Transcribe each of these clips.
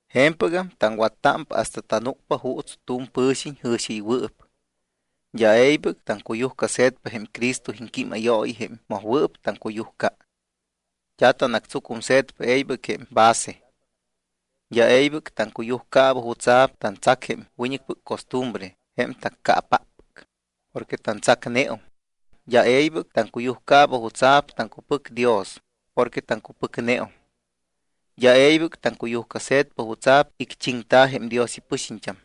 Je̱mpɨgam taŋwattámpa hasta tanúcpa juuts tu̱m pɨ̱xiñ jɨ̱xiɨywɨɨp. D́a e̱ybɨc taŋcuyujcase̱tpa jém Cristo iŋquímayooyi jém mojwɨɨp taŋcuyujca. D́a tanatsucumse̱tpa e̱ybɨc jém base. D́a e̱ybɨc taŋcuyujcaaba jutsa̱p tantsac jém wiñɨcpɨc costumbre jém taccaapáppɨc, porque tantsacneum. D́a e̱ybɨc taŋcuyujcaaba jutsa̱p taŋcupɨc Dios porque taŋcupɨcneum. D́a e̱ybɨc taŋcuyujcase̱tpa jutsa̱p icchiŋta̱ jém Dios ipɨxiñt́am,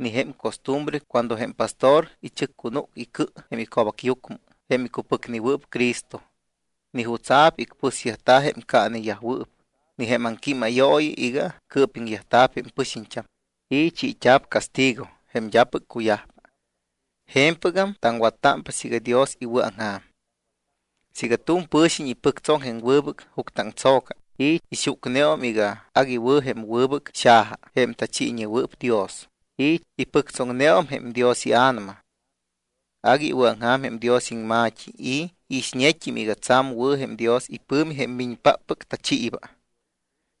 ni jém costumbre cuando jém pastor ichɨccunúc icɨ jém ico̱bacyucmɨ jém icupɨcnewɨɨp Cristo, ni jutsa̱p icpɨsyajta̱ jém caaneyajwɨɨp, ni jém aŋquímayooyi iga cɨɨpiŋyajta̱p jém pɨxiñt́am y chiit́a̱p castigo jém d́apɨc cuyajpa. Je̱mpɨgam taŋwattámpa siiga Dios iwɨ̱aŋja̱m. Siiga tu̱m pɨ̱xiñ ipɨctsoŋ jém wɨbɨc juctɨaŋtso̱ca, y ixucneum iga agui wɨ̱ jém wɨbɨc xaja, jém tachiiñewɨɨp Dios, y ipɨctsoŋneum jém Dios iA̱nama, agui iwɨ̱aŋja̱m jém Dios iŋma̱t́i y iixñet́im iga tsa̱m wɨ̱ jém Dios ipɨ̱mi jém miñpáppɨc tachiiba.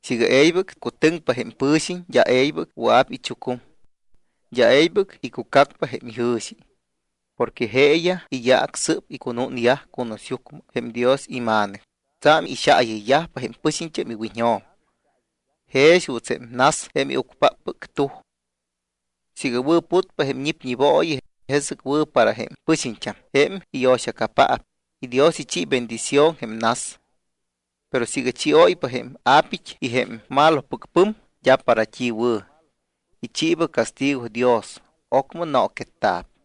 Siiga e̱ybɨc cutɨŋpa jém pɨ̱xiñ, d́a e̱ybɨc wɨa̱p ichucum. D́a e̱ybɨc icucacpa jém ijɨ̱xi. Porque jeeyaj iyaac sɨ́p icunúñyaj cunusyucmɨ jém Dios iMa̱nɨc, tsa̱m ixaayɨyyajpa jém pɨxiñt́am iwiñjo̱m, jex juuts jém nas jém iucpáppɨc tuj. Siiga wɨ̱putpa jém ñipñibooyi, jesɨc wɨ̱ para jém pɨxiñt́am jém iyo̱xacapaap y Dios ichi bendición jém nas. Pero siiga chióypa jém a̱pit́yaj y jém malopɨc pɨm, d́a para t́i wɨ̱. Ichiiba castigo Dios, ocmɨ nooquetta̱p.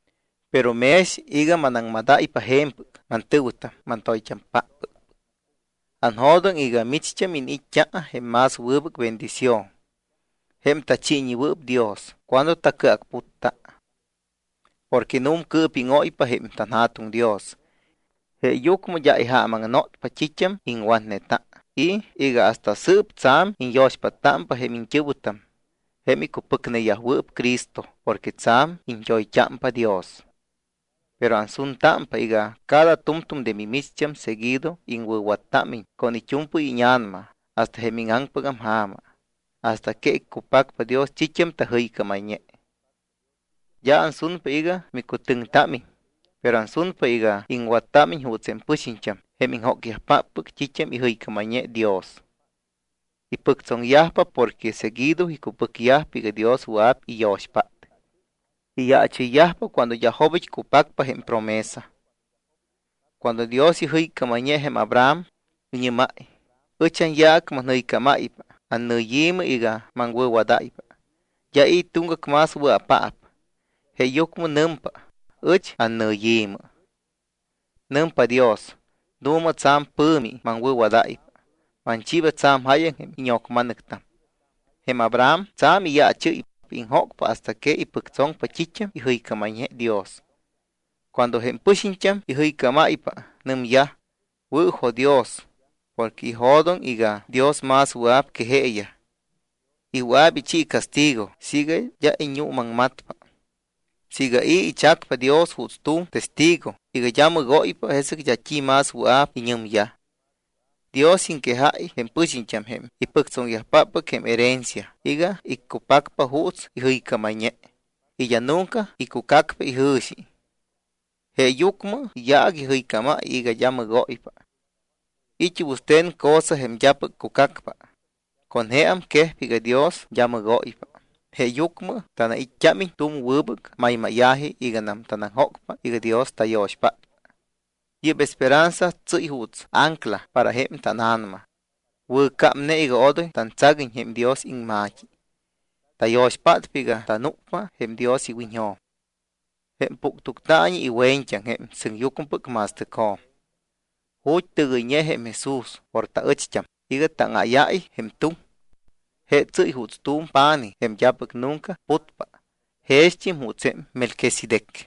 Pero mex iga manaŋmadáypa je̱mpɨc, mantɨ̱wɨtam, mantoyt́ampáppɨc, anjo̱doŋ iga micht́am iniit́t́a jém más wɨbɨc bendición, jém tachiiñewɨɨp Dios cuando tacɨacputpa. Porque nu̱mcɨɨpíŋóypa jém tanJa̱tuŋ Dios. Jeeyucmɨ d́a ijaamaŋnotpa t́it́am iŋwatneta y iga hasta sɨɨp tsa̱m iñyo̱xpáttámpa jém iñt́ɨ̱wɨtam jém icupɨcneyajwɨɨp Cristo porque tsa̱m iñt́oyt́ámpa Dios. Pero ansuntámpa iga cada tu̱mtu̱m de mimicht́am seguido iŋwɨ̱wattámiñ con it́u̱mpɨy íña̱nama hasta jém íŋaŋpɨgam ja̱ma hasta que iccupacpa Dios t́it́am tajɨycámayñe. D́a ansunpa iga micut́íña̱támiñ, pero ansunpa iga iŋwattámiñ juuts jém pɨxiñt́am jém iŋjócyajpáppɨc t́it́am ijɨycámayñe Dios. Ipɨctsoŋyajpa porque seguido icupɨcyajpa iga Dios wɨa̱p iyo̱xpát. Iyaachɨyyajpa cuando d́a jobit́ cupacpa jém promesa. Cuando Dios ijɨycámayñe jém Abraham, iñɨ́máy: “Ɨch anyaac manjɨycámáypa annɨyi̱mɨ iga maŋwɨ̱wadáypa.” D́a i̱ tuŋgac más wɨa̱paap, jeeyucmɨ nɨmpa: “Ɨch annɨyi̱mɨ.” Nɨmpa Dios: “Nu̱ma, tsa̱m pɨ̱mi maŋwɨ̱wadáypa. Manchiiba tsa̱m jáyaŋ íño̱cma̱nɨctam.” Jém Abraham tsa̱m iyaachɨ́ypa, iŋjócpa hasta que ipɨctsoŋpa t́it́am ijɨycámayñe Dios. Cuando jém pɨxiñt́am ijɨycámpa, nɨmyaj: Wɨ̱jo̱dios porque ijo̱doŋ iga Dios más wɨa̱p que jeeyaj y wɨa̱p ichi castigo siiga d́a iñuumaŋmatpa. Siiga i̱ ichacpa Dios juuts tu̱m testigo iga d́a mɨgóypa, jesɨc d́a t́i más wɨa̱p iñɨmyaj. Dios iŋquejáy jém pɨxiñt́am jém ipɨctsoŋyajpáppɨc jém herencia iga iccupacpa juuts ijɨycámayñe y d́a nunca icucacpa ijɨ̱xi. Jeeyucmɨ iyaac ijɨycám iga d́a mɨgóypa. It́ wɨste̱n cosa jém d́apɨc cucacpa, con jeam quejpa iga Dios d́a mɨgóypa. Jeeyucmɨ tanait́t́ámiñ tu̱m wɨbɨc maymáya̱ji iganam tanaŋjócpa iga Dios tayo̱xpátpa. Yɨ́p esperanza tsɨ́y juuts ancla para jém tána̱nama, wɨ̱cámne iga odoy tantsaguiñ jém Dios iŋma̱t́i. Tayo̱xpátpa iga tanúcpa jém Dios iwiñjo̱m, jém puctuctaañi iwe̱ñt́aŋ, jém sɨŋyucmɨpɨc ma̱stɨcjo̱m, ju̱t́ tɨgɨyñe jém Jesús por taɨcht́am iga táŋáyáy jém tuŋ. Je tsɨ́y juuts tu̱m pa̱nij jém d́apɨc nunca putpa, jext́im juuts jém Melquisedec.